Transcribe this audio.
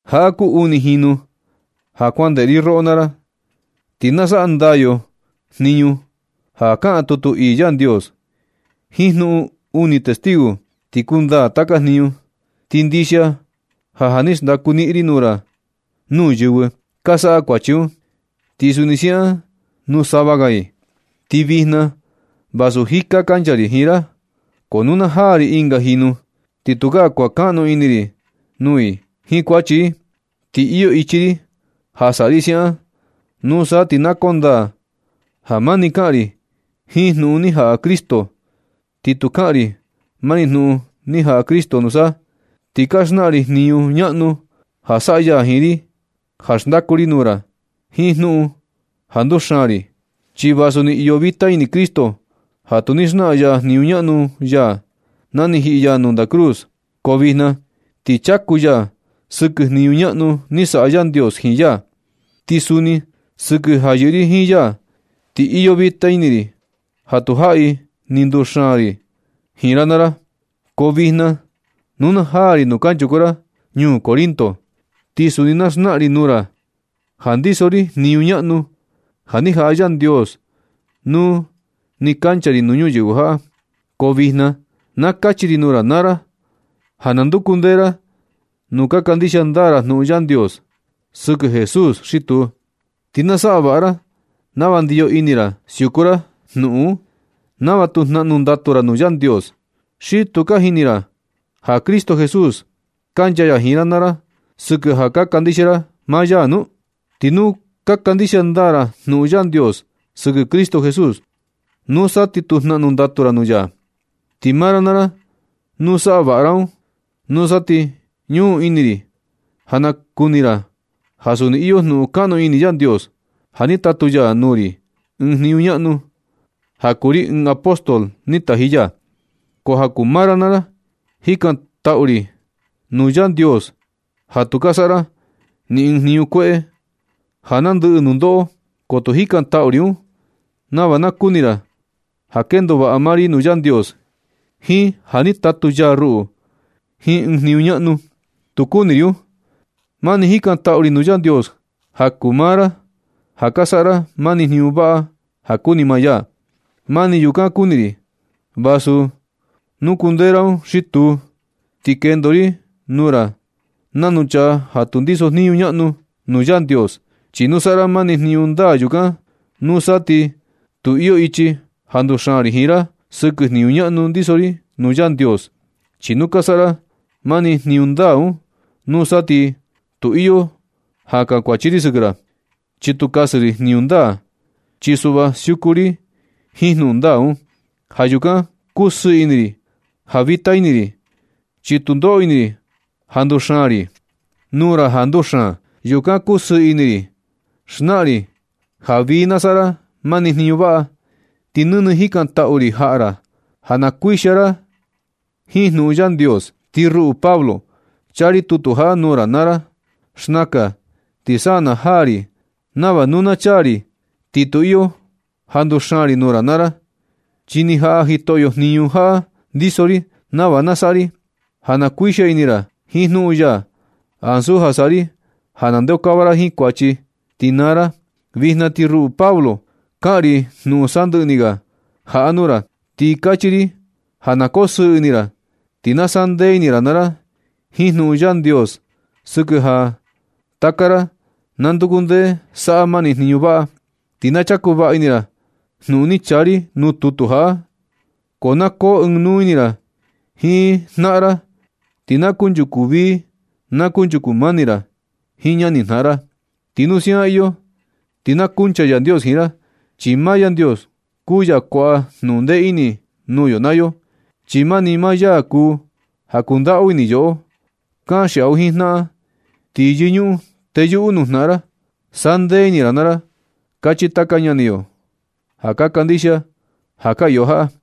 Jaꞌa kuu uni jinu ja kuan ndeꞌe ri roꞌo naa ra. Ti na saꞌa ndaa yo jniñu ja kaꞌan tutu ii Yandios. Jiin jnuꞌun uni testigo ti kundaa taka jniñu. Ti ndixia ja ja ni xndaku niꞌin ri nuu yɨvɨ ka saꞌa kuachi un, ti suni siaꞌan nuu sava ga i. Ti vijna vasu jika kancha ri jiin ra, ko nu na jaa ri ɨnga jinu, ti tukaa kuankaꞌnu ini ri nuu i jiin kuachi i. Ti iyo ichi ri ja saꞌa ri siaꞌan, nusa ti na kondaa ja mani kaꞌan ri jiin jnuꞌun ni jaꞌa Cristo. Ti nu kaꞌan ri mani jnuꞌun ni jaꞌa Cristo, nusa ti na xnaꞌan ri jniñu ñaꞌnu ja saꞌa ya jiin ri ja xndaku ri, nuu ra jiin jnuꞌun ja nduxaan ri. Chi vasu ni iyo vita ini Cristo ja tu ni xnaꞌan ya jniñu ñaꞌnu ya na ni jiꞌi ya nuu ndaꞌa cruz, ko vijna ti chaku ya sɨkɨ jniñu ñaꞌnu ni saꞌa Yandios jiin ya. Ti suni sɨkɨ ja yɨꞌɨ ri jiin ya, ti iyo vita ini ri ja tu jaꞌi ni nduxaan ri jiin ra naa ra. Ko vijna nu na jaa ri nuu kanchuku ra ñuu Corinto, ti suni na xnaꞌan ri nuu ra ja ndiso ri jniñu ñaꞌnu ja ni jaꞌa Yandios nuu nɨ kancha ri ñuyɨvɨ jaꞌa. Ko vijna na kachi ri nuu ra naa ra, ja na nduku ndee ra nu ka kandixia ndaa ra jnuꞌun Yandios sɨkɨ Jesús xi tuu. Ti na saꞌa vaꞌa ra nava ndiyo ini ra siuku ra jnuꞌun un, nava tu jnaꞌnu ndatu ra nuu Yandios. ¿Xi tu ka jini ra ja Cristo Jesús kancha ya jiin ra naa ra sɨkɨ ja ka kandixia ra maa ya nu? Ti nu ka kandixia ndaa ra jnuꞌun Yandios sɨkɨ Cristo Jesús, nusa ti tu jnaꞌnu ndatu ra nuu ya. Ti maa ra naa ra, nu saꞌa vaꞌa ra un, nusa ti ñuꞌun ini ri ja na kuni ra ja suni iyo jnuꞌun kaꞌnu ini Yandios, ja ni tatu ya nuu ri ɨɨn jniñu ñaꞌnu, ja kuu ri ɨɨn apóstol ni taji ya. Ko ja kuu maa ra naa ra, jikantaꞌu ri nuu Yandios ja tu ka saꞌa ra ni ɨɨn jniñu kueꞌe ja nandɨꞌɨ nundoꞌo. Ko tu jikantaꞌu ri un nava na kuni ra ja kendo vaꞌa maa ri nuu Yandios, jiin ja ni tatu ya ruꞌu jiin ɨɨn jniñu ñaꞌnu. Tu kuni ri un. Mani jikantaꞌu ri nuu Yandios ja kuu maa ra, ja ka saꞌa ra mani jniñu vaꞌa ja kuni maa ya. Mani yukan kuni ri, vasu nu kundee ra un xi tuu, ti kendo ri nuu ra nanu chaa ja tu ndiso jniñu ñaꞌnu nuu Yandios. Chi nu saꞌa ra mani jniñu ndaa yukan, nusa ti tu iyo ichi ja nduxaan ri jiin ra sɨkɨ jniñu ñaꞌnu ndiso ri nuu Yandios. Chi nu ka saꞌa ra mani jniñu ndaa un, nusa ti tu iyo ja kankuachi ri sɨkɨ ra, chi tu kasɨ ri jniñu ndaa, chi suꞌva siuku ri jiin jnuꞌun ndaa un. Ja yukan kusɨɨ ini ri ja vita ini ri, chi tu ndoꞌo ini ri ja xndaku ri nuu ra jaa nduxaan. Yukan kusɨɨ ini ri xnaꞌan ri ja vii na saꞌa ra mani jniñu vaꞌa. Ti nɨnɨ jikantaꞌu ri jaꞌa ra ja na kuixia ini ra jiin jnuꞌun Yandios. Ti ruꞌu Pablo, chaa ri tutu jaꞌa nuu ra naa ra xnakan, ti sa na jaa ri nava nu na chaa ri, ti tu iyo ja nduxaan ri nuu ra naa ra. Chi ni jaꞌa Jitoꞌyo jniñu jaꞌa ndiso ri, nava na saꞌa ri ja na uixia ini ra jiin jnuꞌun ya, ansu ja saꞌa ri ja na nandeokava ra jiin kuachi, ti naa ra. Vijna ti ruꞌu Pablo, kaꞌan ri jnuꞌun sandɨꞌɨ ni ga jaꞌa nuu ra. Ti kachi ri ja na kosɨɨ ini ra. Ti na sandee ini ra naa ra jiin jnuꞌun Yandios sɨkɨ ja taka ra na nduku ndee saꞌa mani jniñu vaꞌa. Ti na chaku vaꞌa ini ra jnuꞌun ni chaa ri nuu tutu jaꞌa. Na koo ɨɨn nuu ini ra jiin jnaꞌan ra, ti na kunchuku vii na kunchuku mani ra jiin ñanijnaꞌan ra. Ti nu siaꞌan iyo ti na kuncha Yandios jiin ra, chi maa ni Yandios kuu ya kuaꞌa jnuꞌun ndee ini nuu yo naa yo, chi mani maa ya kuu ja kundaꞌu ini yoꞌo. Kanxiaꞌu jiin jnaꞌan, ti yɨñuꞌun teyuꞌu nuu jnaꞌan ra. “Saꞌa ndee ini naa ra”, kachi taka ñani yo ka kandixia ja ka iyo jaꞌa.